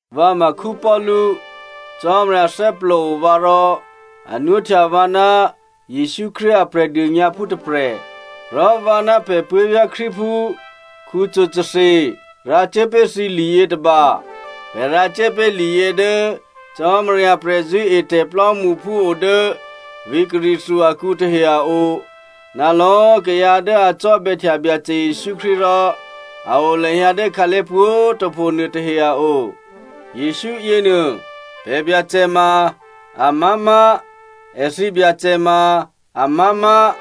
Vǎ ma Paulu. Cò́marya thè́plòo vǎ rò a nwóhtya vǎ ná Jesǔ Krístu a Prè̤dônyǎphú tôprè̤. Rò vǎ ná pè̤ puố̤vyá̤ Krístuphú Sostheno rǎcuố pé̤ thǐ liyětôba. Pè̤ rǎcuố pé̤ liyě dố Cò́marya prè̤zṳ̂́etè̤ plò́mṳphú o dố vǐ̤ Corinthia akǔ tahe a o, ná lò̌꤮ kayǎ dố a cò́bè̌htya Byacè Jesǔ Krístu rò a o lahyǎ dố khǎlé̤ pwǒ̤꤮ tôpho nuôtahe a o. Jesǔ yěnuô, pè̤ Byacè ma amá̤má̤, èthǐ Byacè ma amá̤má̤.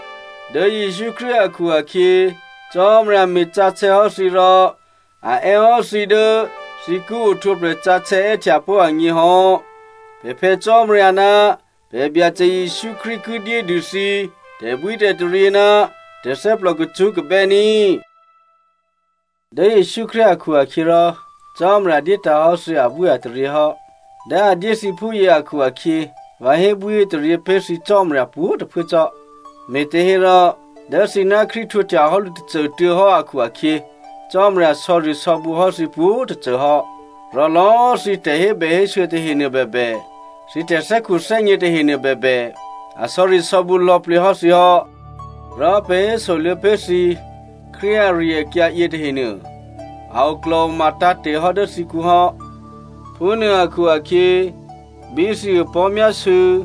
Dố Jesǔ Krístu akhu-akhyě Cò́marya me̤sǎsè̌hò́ thǐ rò a è́hò́ thǐ dố thǐ ki ohtwǒprè̤ sǎsè̌ è́htya pó̤ agně hò́. Pè̤ Phè̌ Cò́marya ná pè̤ Byacè Jesǔ Krístu ki dyé dû thǐ tè̤bwítè̤taryě ná tè̤thè́plò kacṳ́kabè́ ní꤮. Dố Jesǔ Krístu akhu-akhyěrò Cò́marya dyétǎ̤hò́ thǐ abwíataryě hò́. Dố a dyé thǐ phúyě akhu-akhyě, vǎ hébwíhétaryě pé̤ thǐ Cò́marya pwǒ̤꤮ tôphuố cò́. Me̤těhérò, dố thǐ ná Krístu htwǒhtyahò́ lǔ tôcô꤮ tuô̌ hò́ akhu-akhyě, Cò́marya sò̌risò̌bǔ hò́ thǐ pwǒ̤꤮ tôcô hò́. Rò lò̌꤮ thǐ tè̤hébèhésû̌ tahenuô bèbè, thǐ tè̤thè́khuthè́gně tahenuô bèbè, a sò̌risò̌bǔ lò̌plǐ hò́ thǐ hò́. Rò pè̤ hésoluô̌ pé̤ thǐ Krístu ari-akyǎ yětahenuô, a oklò̤oma tǎ̤te̤ hò́ dố thǐkǔ hò́. Phúnuô akhu-akhyě, bí thǐ opò̤́myásû̌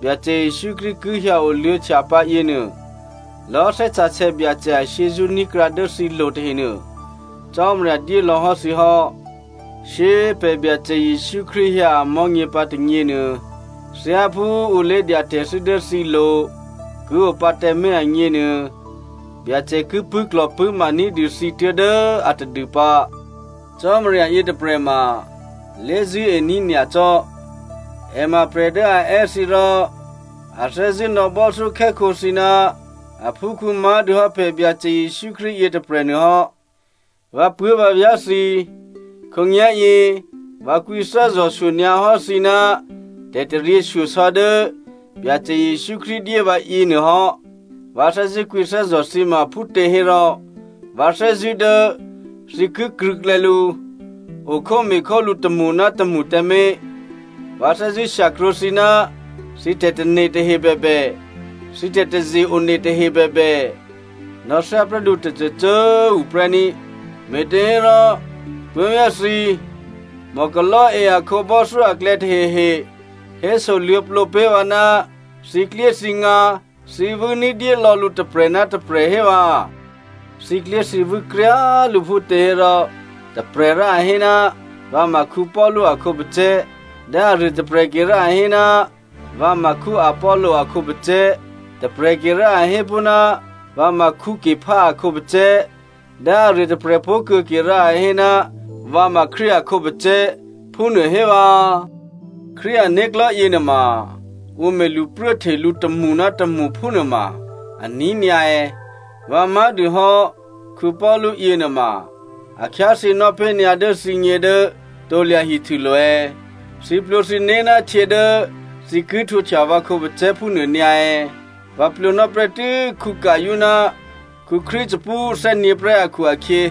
Byacè Jesǔ Krístu ki hyǎoluô̌htya pǎ yěnuô, lò̌꤮ Thè́ Sǎsè̌ Byacè ashyězṳ́ ní̤krǎ dố thǐ lo tahenuô Cò́marya dyé lò̌ hò́ thǐ hò́. Shyé꤮ pè̤ Byacè Jesǔ Krístu hyǎ amò̤́nyě pǎ tônyěnuô, thyáphú ǔ lé̤dya tè̤thû́ dố thǐlo̤ ki o pǎ tǎmé̤ agněnuô, Byacè ki pṳ̂́klò̤pṳ̂́ma ní̤dû thǐ tuố̤dố a tadû pǎ. Cò́marya yětôprè̤ ma lé̤zṳ̂́ení̤ nyacò́. È ma prè̤ dố a è́ thǐ rò a thè́zṳ̂́ nò̌ bò́thyókhè́khǒ thǐ ná aphúkhǔ má̤dûhò́ pè̤ Byacè Jesǔ Krístu yětôprè̤nuô hò́. Vǎpuố̤vǎvyá̤ thǐ꤮ khǒnyá̤yě vǎ kwǐthè́zò̤ shyonyǎ hò́ thǐ ná tè̤taryěshyosò̌ dố Byacè Jesǔ Krístu dyé vǎ yěnuôhò́. Vǎ thè́zṳ̂́ kwǐthè́zò̤ thǐ ma phútěhérò, vǎ thè́zṳ̂́ dố thǐ ki krṳ̂̌klè̌ lǔ, okhóme̤khólǔ tômṳ ná tômṳ tǎmé̤. Vǎ thè́zṳ̂́ shyakrwǒ thǐ ná thǐ tè̤tane̤ tahe bèbè, thǐ tè̤taze-one tahe bèbè, nò̌ thyá prè́ lǔ tôcôcô꤮ tuô̌ prè́ ní꤮. Me̤těhérò, puố̤vyá̤ thǐ꤮, Chloe a khǒbò́thyó aklè̌ tahehe hésoluô̌plǒ pé̤ vǎ, thǐklyéthǐngǎ thǐvû́ ní̤dyé lò̌ lǔ tôprè̤ ná tôprè̤ hé vǎ꤮, thǐklyéthǐvû́ kryá꤮ lǔ phútěhérò, tôprè̤ rò a hé, “Vǎ ma Paulu a khǒpacè̤̌” dố aruô tôprè̤ ke rò a hé, “Vǎ ma Apollo a khǒpacè̤̌,” tôprè̤ke rò a hé pó̤, “Vǎ ma Cepha a khǒpacè̤̌,” dố aruô tôprè̤ pó̤ kuô̌ ke rò a hé, “Vǎ ma Krístu a khǒpacè̤̌,” phúnuô hé vǎ. Krístu ané̤klò̤́ yěnuôma ǔ me̤ lṳpruố hte lǔ tômṳ ná tômṳ phúnuôma aní̤ nyǎ è̌? Vǎ má̤dûhò́ Paulu yěnuôma a khyáthyěnò́ pé̤ nyǎ dố thǐgně dố krusulo̤ è̌? Thǐ plwǒ thǐné̤ ná htyě dố thǐ ki htwǒhtya vǎ khǒpacè̤̌ phúnuô nyǎ è̌? Vǎ plwǒnò́ prè́tû́ Gaio ná Crispu thè́nyě̤prè́ akhu-akhyě,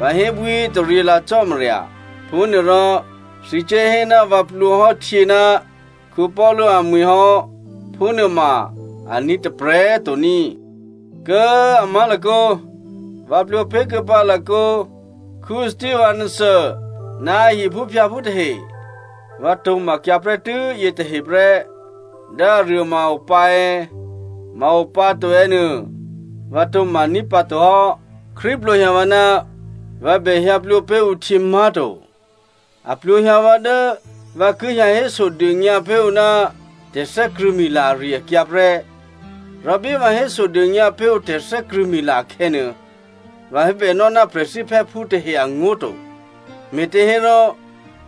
vǎ hébwíhétaryě lǎ Cò́marya. Phúnuôrò, thǐ cuốhé ná vǎ plwǒ hò́ htyě ná Paulu amwi̤ hò́, phúnuôma aní̤ tôprè̤ to ní꤮. (Kố꤮ a má̤lakǒ, vǎ plwǒ pé̤ kuô̌pǎ lakǒ Stephana ná a hiphúphyǎphú tahe. Vǎ tǒ̤makyǎ prè́tû́ yětahe prè́. Dố aruô ma a opǎ è̌, ma a o pǎ to è̌ nuô vǎ tǒ̤maní̤ pǎ to hò́.) Krístu plwǒhyǎ vǎ ná vǎ bèhyǎ plwǒ pé̤ ǔ htyě má̤to. A plwǒ hyǎ vǎ dố vǎ ki hyǎ hésodônyǎ pé̤ ǔ ná tè̤thè́krṳ̂̌mila ari-akyǎ prè́. Rò bí vǎ hésodônyǎ pé̤ ǔ tè̤thè́krṳ̂̌mila akhè̌nuô, vǎ hébènò́ ná prè̤thíphè́phú tahe angó̤ to. Me̤těhérò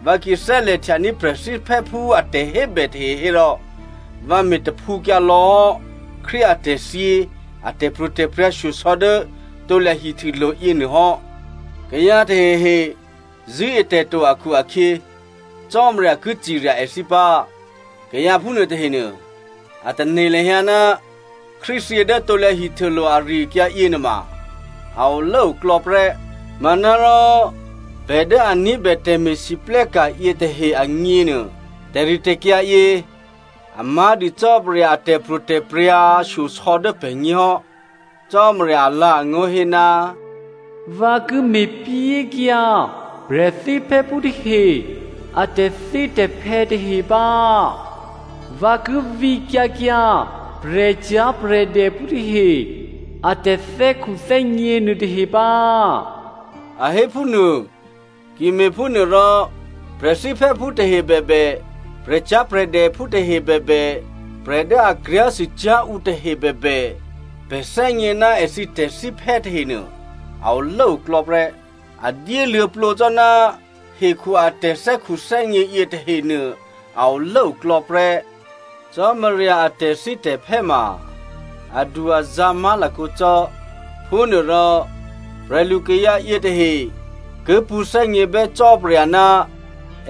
vǎ ki thè́lè̤htyaní̤ prè̤thíphè́phú a tè̤hébè tahe hérò, vǎ me̤ taphǔkyǎ lò̌ hò́ Krístu atè̤thyě a tè̤pro̤tè̤prya̤ shyosò̌ dố krusulo̤ yěnuô hò́. Kayǎ tahehe zṳ̂́e tè̤ to akhu-akhyě, Cò́marya ki cirya èthǐ pǎ. Kayǎ phúnuô tahenuô, a tane̤ lahyǎ ná Krístu thyě dố krusulo̤ ari-akyǎ yěnuôma a olốoklò̌ prè́. Manárò pè̤ dố a ní̤bè tè̤me̤lwóhteka̤ yětahe agněnuô, tè̤ritè̤kyǎ yě a má̤dû Cò́marya a tè̤pro̤tè̤prya̤ shyosò̌ dố pè̤gně hò́. Cò́marya alǎ̤angó̤ hé, “Vǎ ki me̤pyékyǎ prè̤thíphè́phú tahe a tè̤thítè̤phè́ tahe pǎ. Vǎ ki vǐkyǎ kyǎ prè̤cyá̤prè̤dèphú tahe a tè̤thè́khuthè́gně nuôtahe pǎ,” a hé phúnuô. Ki me̤phúnuôrò prè̤thíphè́phú tahe bèbè, prè̤cyá̤prè̤dèphú tahe bèbè, prè̤ dố a kryá̤sûcyá̤ ǔ tahe bèbè, pè̤ thè́gně ná èthǐ tè̤thíphè́ tahenuô, a olốoklò̌ prè́. A dyéluô̌plǒ cò́, hekhu a tè̤thè́khuthè́gně yětahenuô a olốoklò̌ prè́. Cò́marya a tè̤thítè̤phè́ ma adu-azǎ̤ má̤lakǒ cò́. Phúnuôrò prè̤lukayǎ yětahe ki pṳ̌thè́gněbè́ Cò́marya ná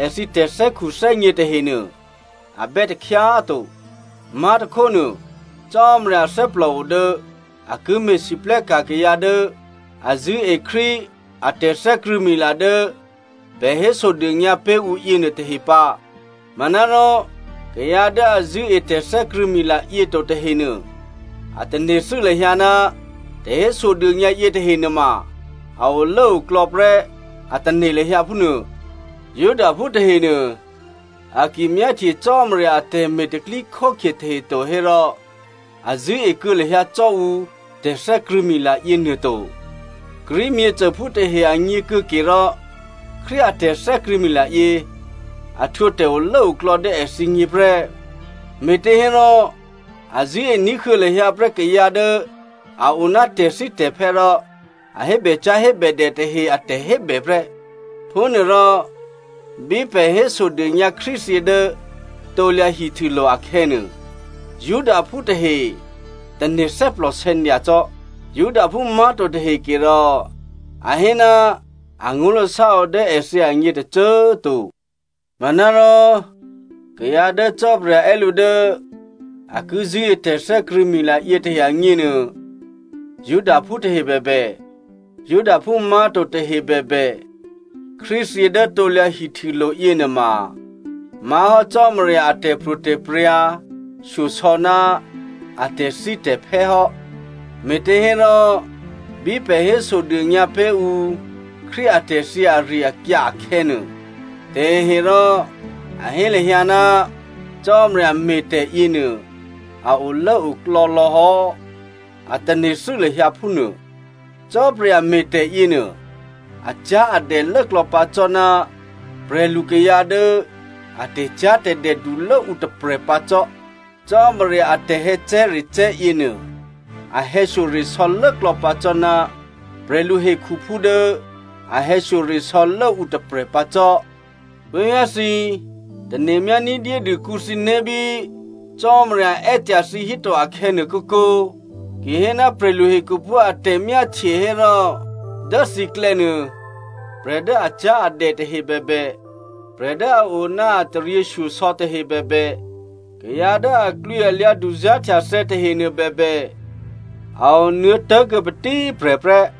èthǐ tè̤thè́khuthè́gně tahenuô, a bè́ takhyá꤮ to. Má̤tôkhónuô, Cò́marya thè́plòo dố a ki me̤lwóhteka̤ kayǎ dố a zṳ̂́e Krístu a tè̤thè́krṳ̂̌mila dố pè̤ hésodônyǎ pé̤ ǔ yěnuô tahe pǎ. Manárò kayǎ dố a zṳ̂́e tè̤thè́krṳ̂̌mila yě to tahenuô, a tane̤thû́ lahyǎ ná tè̤hésodônyǎ yětahe nuôma a olốoklò̌ prè́, a tane̤ lahyǎ phúnuô. Judaphú tahenuô, a ki myáhtye Cò́marya atè̤me̤ tè̤pro̤tè̤prya̤ tahe to hérò, a zṳ̂́e kuô̌ lahyǎ cò́ ǔ tè̤thè́krṳ̂̌mila yěnuô to. Greek myěcôphú tahe agně kuô̌ke rò, Krístu a tè̤thè́krṳ̂̌mila yě a htwǒ tè̤olốoklò̌ dố èthǐgně prè́, me̤těhérò a thè́zṳ̂́ ní̤huô̌ lahyǎ prè́ kayǎ dố a o ná tè̤thítè̤phè́ rò a hébècyá̤hébèdè tahe a tè̤hébè prè́. Phúnuôrò bí pè̤ hésodônyǎ Krístu thyě dố krusulo̤ akhè̌nuô, Judaphú tahe tane̤ thè́plòsè̌ nyacò́. Judaphú má̤to tahe ke rò a hé ná angó̤lasá o dố èthǐ agně tôcô꤮ to. Manárò kayǎ dố Cò́marya è́ lǔ dố a ki zṳ̂́e tè̤thè́krṳ̂̌mila yětahe agněnuô, Judaphú tahe bèbè, Judaphú má̤to tahe bèbè, Krístu thyě dố krusulo̤ yěnuôma má̤hò́ Cò́marya a tè̤pro̤tè̤prya̤ shyosò̌ ná a tè̤thítè̤phè́ hò́. Me̤těhérò, bí pè̤ hésodônyǎ pé̤ ǔ Krístu atè̤thyě ari-akyǎ akhè̌nuô, taheherò a hé lahyǎ ná Cò́marya me̤tè̤ yěnuô, a olốoklò̌ lò̌ hò́, a tane̤thû́ lahyǎ phúnuô. Cò́marya me̤tè̤ yěnuô, acyá̤adè lốklò̌ pǎ cò́ ná prè̤lukayǎ dố a tè̤cyá̤tè̤dè dulố ǔ tôprè̤ pǎ cò́. Cò́marya a tè̤hè̌cè̤́recè̤́ yěnuô, a hè̌shyoresò̌ lốklò̌ pǎ cò́ ná prè̤lu hekhuphú dố a hè̌shyoresò̌ lố ǔ tôprè̤ pǎ cò́. Puố̤vyá̤ thǐ꤮, tane̤myá ní̤dyédû kǔ thǐné̤ bí Cò́marya è́ tyahí thǐ to akhè̌nuô kǒkǒ. Ki hé ná prè̤lu hekhuphú a tè̤myáhtye hérò, dố thǐklè̌nuô, prè̤ dố acyá̤adè tahe bèbè, prè̤ dố a o ná a taryěshyosò̌ tahe bèbè, kayǎ dố aklwǐalyǎ duzá̤htyathè̌ tahenuô bèbè, a o nuô̌ tố̤kuô̌ patíprè̤ prè́.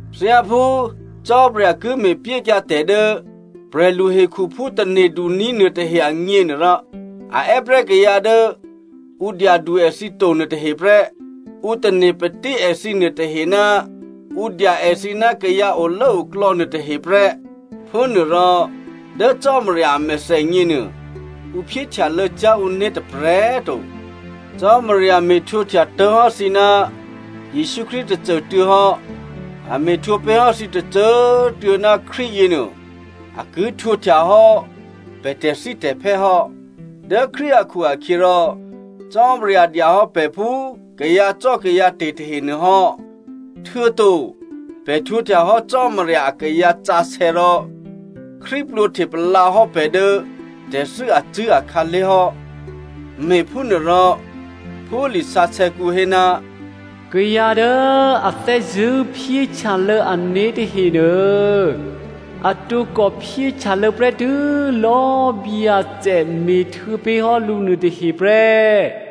Thyáphú Cò́marya ki me̤pyékyǎ tè̤ dố prè̤lu hekhuphú tane̤duní̤ nuôtahe agněnuôrò, a è́ prè́ kayǎ dố ǔ dyadu èthǐ to nuôtahe prè́, ǔ tane̤patí èthǐ nuôtahe ná ǔ dya èthǐ ná kayǎ olốoklò̌ nuôtahe prè́. Phúnuôrò, dố Cò́marya a mèthènyěnuô, ǔ phyéhtyalô̌ cyá̤ ǔné̤ tôprè̤꤮ to. Cò́marya me̤htwǒhtya tố̤hò́ thǐ ná Jesǔ Krístu tôcô꤮ tuô̌ hò́. A me̤htwǒ pé̤ hò́ thǐ tôcô꤮ tuô̌ ná Krístu yěnuô, a ki htwǒhtya hò́ pè̤ tè̤thítè̤phè́ hò́. Dố Krístu akhu-akhyěrò Cò́marya dya hò́ pè̤ phú kayǎcò́kayǎte̤ tahenuô hò́. Htuô̌to pè̤ htwǒhtya hò́ Cò́marya akayǎ sǎsè̌ rò Krístu plwǒhte palǎ hò́ pè̤ dố tè̤thû́ acṳ̂́ akhǎlé̤ hò́. Me̤phúnuôrò, phú lisǎsè̌kǔ hé, “Kayǎ dố a thè́zṳ̂́ phyéhtyalô̌ ané̤ tahenuô, a tǒkò phyéhtyalô̌ prè́tû́ lò̌ Byacè me̤htuô̌ pé̤ hò́ lǔ nuôtahe prè́.”